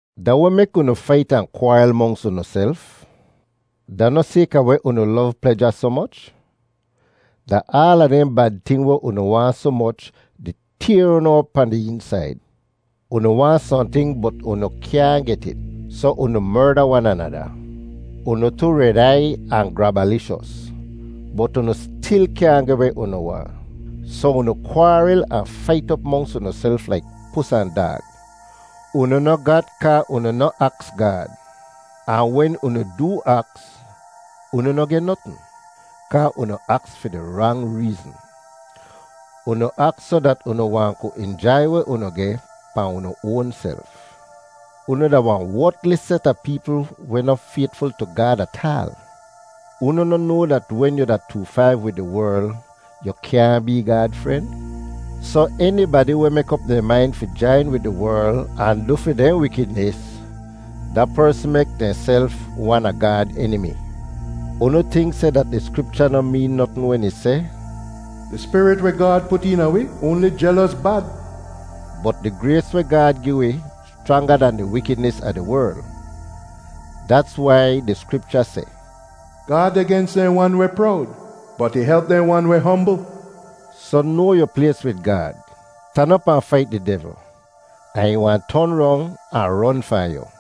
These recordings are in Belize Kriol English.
Da weh mek unu fait ahn kwaaril monks unuself? Da noh sayka weh unu lov pleja soh moch? Da aala dehn bad ting weh unu waahn soh moch di tayr unu op pahn di eensaid. Unu waahn sohnting bot unu kyaahn get it, soh unu merda wan anada. Unu tu red aiy ahn grabalishos, bot unu stil kyaahn geh weh unu waahn. Soh unu kwaaril ahn fait op monks unuself laik pus ahn daag. Unu noh gat kaa unu noh aks Gaad. Ahn wen unu doo aks, unu noh geh notn, kaa unu aks fi di rang reezn. Unu aks soh dat unu wahn ku injai weh unu geh pahn unu oanself. Unu da wahn wotlis set a peepl weh noh faytful tu Gaad ataal! Unu noh noa dat wen yu da too faiv wid di werl, yoo kyaahn bee Gaad fren? Soh enibadi weh mek op dehn main fi jain wid di werl ahn du fi dehn wikidnis, da persn mek dehnself wan a Gaad enimi. Unu tink seh dat di Skripcha noh meen notn wen ih seh, “Di spirit weh Gaad put eena wi oanli jelos bad?” Bot di grays weh Gaad gi wi schranga dan di wikidnis a di werl. Dats wai di Skripcha seh, “Gaad deh gens dehn wan weh prowd, bot ih help dehn wan weh hombl.” Soh noa yu plays wid Gaad. Stan op ahn fait di devl, ahn ih wahn ton rong ahn ron fahn yu.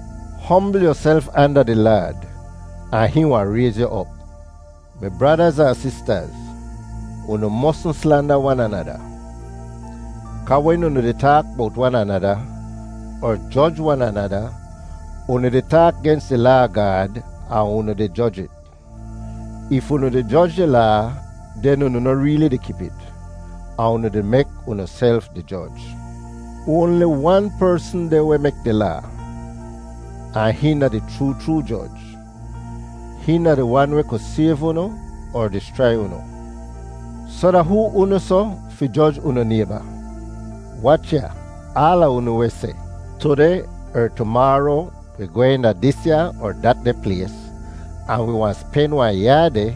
Hombl yuself anda di Laad, ahn hihn wahn rayz yu op. Mi bradaz ahn sistaz, unu mosn slanda wan anada. Kaa wen unu di taak bowt wan anada, er joj wan anada, unu di taak gens di Laa a Gaad ahn unu di joj it. If unu di joj di Laa, den unu noh reeli di kip it, ahn unu di mek unuself di joj. Oanli wan persn deh weh mek di Laa, ahn hihn da di chroo chroo Joj. Hihn da di Wan weh ku sayv unu er dischrai unu. Soh da hoo unu soh fi joj unu nayba? Wach ya, aala unu weh seh, “Tudeh er tumaaro wi gwehn da disya er datdeh plays ahn wi wahn spen wahn yaa deh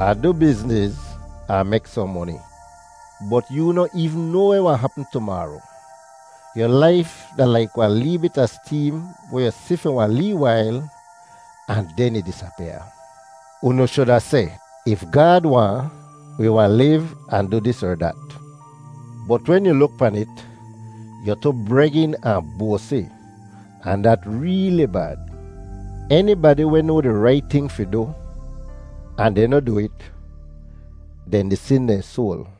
ahn du bizniz ahn mek sohn moni.” Bot yoo noh eevn noa weh wahn hapm tumaaro. Yu laif da laik wahn lee bit a steem weh yu si fi wahn lee wail, ahn den ih disapyaa. Unu shuda seh, “If Gaad waahn, wi wahn liv ahn du dis er dat.” Bot wen yu luk pan it, yu tu bregin ahn boasi, ahn dat reeli bad. Enibadi weh noa di rait ting fi du, ahn dehn noh du it, dehn di sin dehn soal.